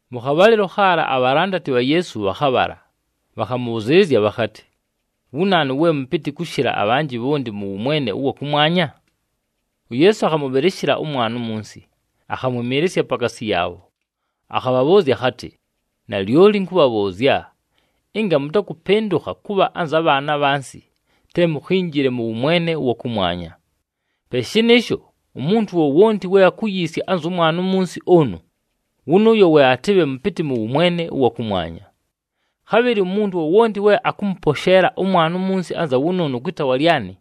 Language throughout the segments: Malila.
Mʉ khabhalɨlo khaala abhalandati bha Yeesu bhakhabhala, bhakhamʉbhʉzɨɨlɨzya bhakhatɨ, “Wu naanu we mʉpɨtɨ kʉshɨla abhanjɨ bhonti mʉ wʉmwene ʉwa kʉmwanya?” UYeesu akhamʉbhɨlɨshɨla ʉmwana umunsi, akhamwɨmɨɨlɨsya pakaasi yaabho, akhabhabhʉʉzya akhatɨ, “Nalyoli ɨnkʉbhabhʉʉzya, ɨnga mʉtakʉpɨndʉkha kʉbha anza bhaana abhansi, te mukhinjile mʉ wʉmwene ʉwa kʉmwanya. Pe shɨnɨɨsho, umuntu wowonti we akuyiisya anzʉ mwana umunsi ʉnʉ, wʉnʉʉyo we atɨbhe mʉpɨtɨ mʉ wʉmwene ʉwa kʉmwanya. Khabhɨlɨ umuntu wowonti we akʉmʉposheela ʉmwana umunsi anza wʉnʉʉnʉ kwɨ taawa lyanɨ,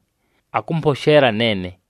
akʉmposheela neene.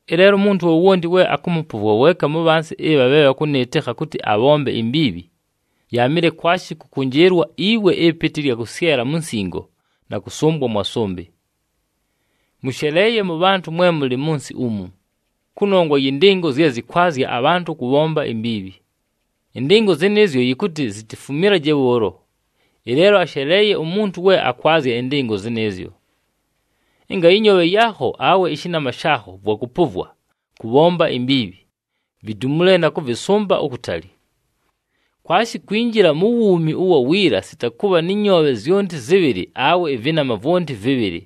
“Ɨleelo umuntu wowonti we akʉmʉpʉvwa weeka mu bhansi ɨbha bhe bhakʉnɨɨtɨkha kʉtɨ abhombe imbiibhi, yaamɨle kwashi kʉkʉnjɨɨlwa iwe ɨpɨtɨ ɨlya kʉsyela mu nsingo na kʉsʉmbwa mwa sʉmbɨ. Mʉsheleeye mʉbhantʉ mwe mʉlɨ mʉ nsɨ umu, kʉnongwa yɨ ndɨngo zye zɨkwazya abhantʉ kʉbhomba imbiibhi! Ɨndɨngo zɨnɨɨzyo yɨkʉtɨ zitifumilaje bhʉʉlo, ɨleelo asheleeye umuntu we akwazya ɨndɨngo zɨnɨɨzyo! Ɨnga ɨnyoobhe yaakho awe ɨshɨnama shaakho vwakʉpʉvwa kʉbhomba imbiibhi, vidumule na kʉvɨsʉmba ukutali. Kwashi kwinjila mu wuumi ʉwa wiila sita kʉbha nɨ nyoobhe zyonti zɨbhɨlɨ awe ɨvɨnama vwonti vɨbhɨlɨ,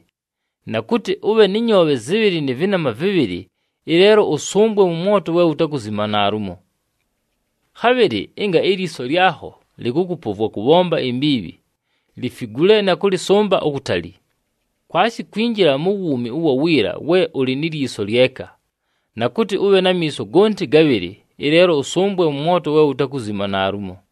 na kʉtɨ ʉbhe nɨ nyoobhe zɨbhɨlɨ nɨ vɨnama vɨbhɨlɨ, ɨleelo ʉsʉmbwe mʉ mwoto we wutakuzima naalumo. Khabhɨlɨ ɨnga ilyiso lyakho lɨkʉkʉpʉvwa kʉbhomba imbiibhi, lifigule na kʉlɨsʉmba ukutali! Kwashi kwinjila mu wuumi ʉwa wiila we ʉlɨ ni lyiso lyeka, na kʉtɨ ʉbhe na miiso gonti gabhɨlɨ, ɨleelo ʉsʉmbwe mʉ mwoto we wutakuzima naalumo.”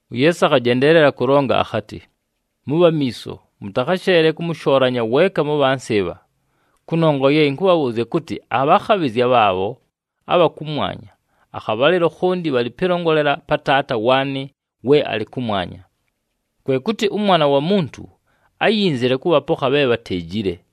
UYeesu akhajendeelela kʉlonga akhatɨ, “Mʉbhe amiiso, mʉtakhasheele kʉmʉshoolanya weeka mu bhansi ɨbha! Kʉnongwa ye ɨnkʉbhabhʉʉzya kʉtɨ, abhakhabhɨzya bhaabho abha kʉmwanya akhabhalɨlo khonti bhalɨ pɨlongolela pa Taata waanɨ we alɨ kʉmwanya. [ Kwe kʉtɨ ʉMwana wa Muntu áyinzile kʉbhapokha bhe bhateejile.]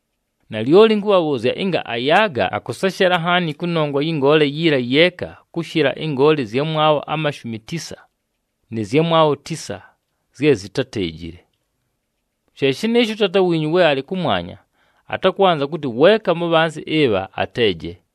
Nalyoli ɨnkʉbhabhʉʉzya, ɨnga ayaaga, akʉseshela nhaani kʉnongwa yɨ ngoole yiila yeeka kʉshɨla ɨngoole ɨzyamwabho amashumi tisa nɨ zyamwabho tisa zye zitáteejile. She shɨnɨɨsho, ʉTaata wiinyu we alɨ kʉmwanya atakwanza kʉtɨ weeka mu bhansi ɨbha ateeje.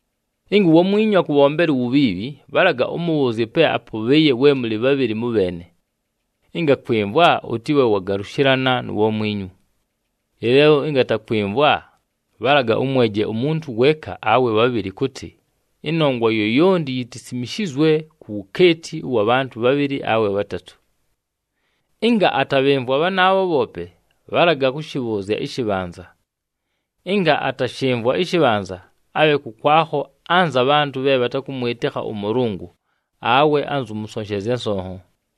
“Ɨnga uwamwinyu akʉbhombela uwubhiibhi, bhalaga ʉmʉbhʉʉzye pe apʉbhɨɨye we mʉlɨ bhabhɨlɨ mʉbheene. Ɨnga akwɨmvwa, ʉtɨbhe wagalʉshɨlana nu wamwinyu. Ɨleelo ɨnga atakwɨmvwa, bhalaga ʉmweje umuntu ʉwamwabho weeka awe bhabhɨlɨ kʉtɨ, ‘Ɨnongwa yoyonti yitisimishizwe ku wukeeti ʉwa bhantʉ bhabhɨlɨ awe bhatatʉ.’ Ɨnga atabhɨmvwa bhanaabho bhoope, bhalaga kʉshɨbhʉʉzya ɨshɨbhanza. Ɨnga atashɨmvwa ɨshɨbhanza, abhe kʉkwakho anza bhantʉ bhe bhatakʉmwɨtɨkha ʉMʉlʉngʉ awe anzʉ mʉsonshezya nsonho.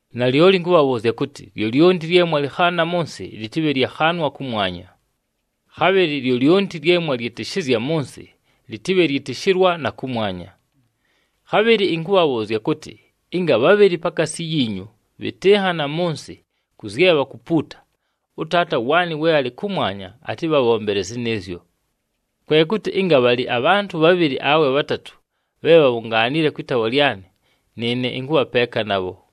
“Nalyoli ɨnkʉbhabhʉʉzya kʉtɨ, lyolyonti lye mwalɨkhaana mʉ nsɨ, lɨtɨbhe lyakhaanwa kʉmwanya. Khabhɨlɨ lyolyonti lye mwalyɨtɨshɨzya mʉ nsɨ, lɨtɨbhe lyɨtɨshɨlwa na kʉmwanya. Khabhɨlɨ ɨnkʉbhabhʉʉzya kʉtɨ, ɨnga bhabhɨlɨ pakaasi yiinyu bhɨtɨnhana mʉ nsɨ kʉ zye bhakupuuta, ʉTaata waanɨ we alɨ kʉmwanya atɨbhabhombele zɨnɨɨzyo. Kwe kʉtɨ ɨnga bhalɨ abhantʉ bhabhɨlɨ awe bhatatʉ bhe bhabhungaanile kwɨ taawa lyanɨ, nɨɨne ɨnkʉbha peeka nabho.”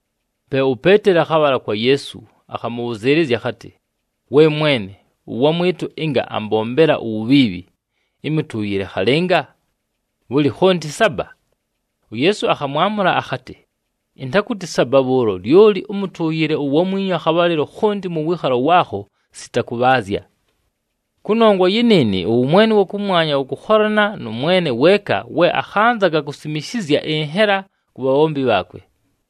Pe uPeeteli akhabhala kwa Yeesu, akhamʉbhʉzɨɨlɨzya akhatɨ, “We Mwene, ʉwamwɨtʉ ɨnga ambombela uwubhiibhi, ɨmʉtʉʉyɨle khalɨnga? Bhʉlɨ, khonti saba?” UYeesu akhamwamʉla akhatɨ, “Ɨntakʉtɨ saba bhʉʉlo, lyoli ʉmʉtʉʉyɨle uwamwinyu akhabhalɨlo khonti mʉ wɨɨkhalo waakho sita kʉbhaazya. “Kʉnongwa yɨnɨɨnɨ, ʉwʉmwene ʉwa kʉmwanya wʉkʉkholana nʉ mwene weeka we akhanzaga kusimishizya ɨnhela ku bhabhombi bhaakwe.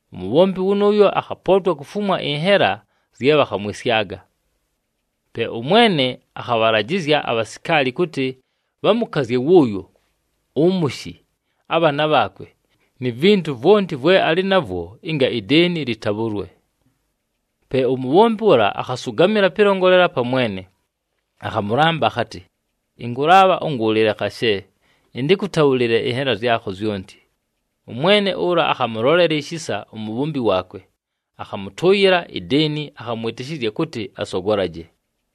Umubhombi wʉnʉʉyo akhapootwa kufumwa ɨnhela zye bhakhamwɨsyaga. Pe ʉmwene akhabhalajɨzya abhasikaali kʉtɨ bhamʉkazye wʉʉyo, ʉmʉshɨ, abhaana bhaakwe, ni vintu vwonti vwe alɨ navwo, ɨnga ideeni lɨtabhʉlwe. “Pe umubhombi ʉla akhasʉgamɨla pɨlongolela pa mwene, akhamʉlamba akhatɨ, ‘Ɨnkʉlaabha ʉngʉʉlɨle khashe, ɨntɨkʉtabhʉlɨle ɨnhela zyakho zyonti.’ Ʉmwene ʉla akhamʉlolela ishisa umubhombi waakwe, akhamʉtʉʉyɨla ideeni, akhamwɨtɨshɨzya kʉtɨ asogolaje.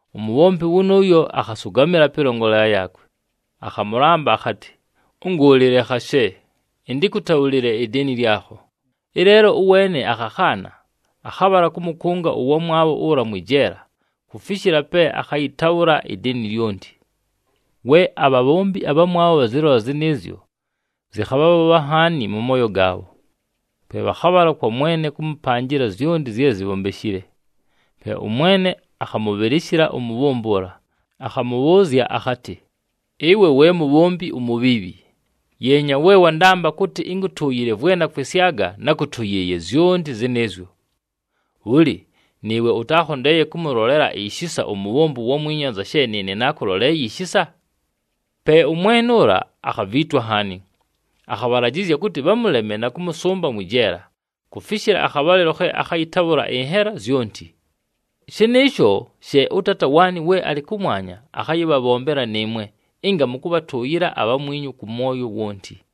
Umubhombi wʉnʉʉyo akhasʉgamɨla pɨlongolela yaakwe, akhamʉlamba akhatɨ, ‘Ʉngʉʉlɨle khashe, ɨntɨkʉtabhʉlɨle ideeni lyakho.’ Ɨleelo ʉweene akhakhaana, akhabhala kʉmʉkʉnga ʉwamwabho ʉla mwɨ jeela kufishila pe akhayɨtabhʉla ideeni lyonti. “We abhabhombi abhamwabho bhazɨlola zɨnɨɨzyo, zɨkhabhabhobha nhaani mʉ mooyo gaabho. Pe bhakhabhala kwa mwene kʉmʉpanjɨla zyonti zye zibhombeshile. Pe ʉmwene akhamʉbhɨlɨshɨla umubhombi ʉla, akhamʉbhʉʉzya akhatɨ, ‘Ɨwe we mubhombi umubhiibhi! Yeenya we wandamba kʉtɨ ɨnkʉtʉʉyɨle vwe nakwɨsyaga, nákʉtʉyɨɨye zyonti zɨnɨɨzyo! Bhʉlɨ, nɨɨwe ʉtaakhondeeye kʉmʉlolela ishisa umubhombi uwamwinyu anza she nɨɨne naakʉloleeye ishisa?’ “Pe ʉmwene ʉla akhaviitwa nhaani, akhabhalajɨzya kʉtɨ bhamʉleme na kʉmʉsʉmba mwɨ jeela kufishila akhabhalɨlo khe akhayɨtabhʉla ɨnhela zyonti. “Shɨnɨɨsho she ʉTaata waanɨ we alɨ kʉmwanya akhayɨbhabhombela nɨɨmwe ɨnga mʉtakʉbhatʉʉyɨla abhamwinyu kʉ mwoyo wonti.”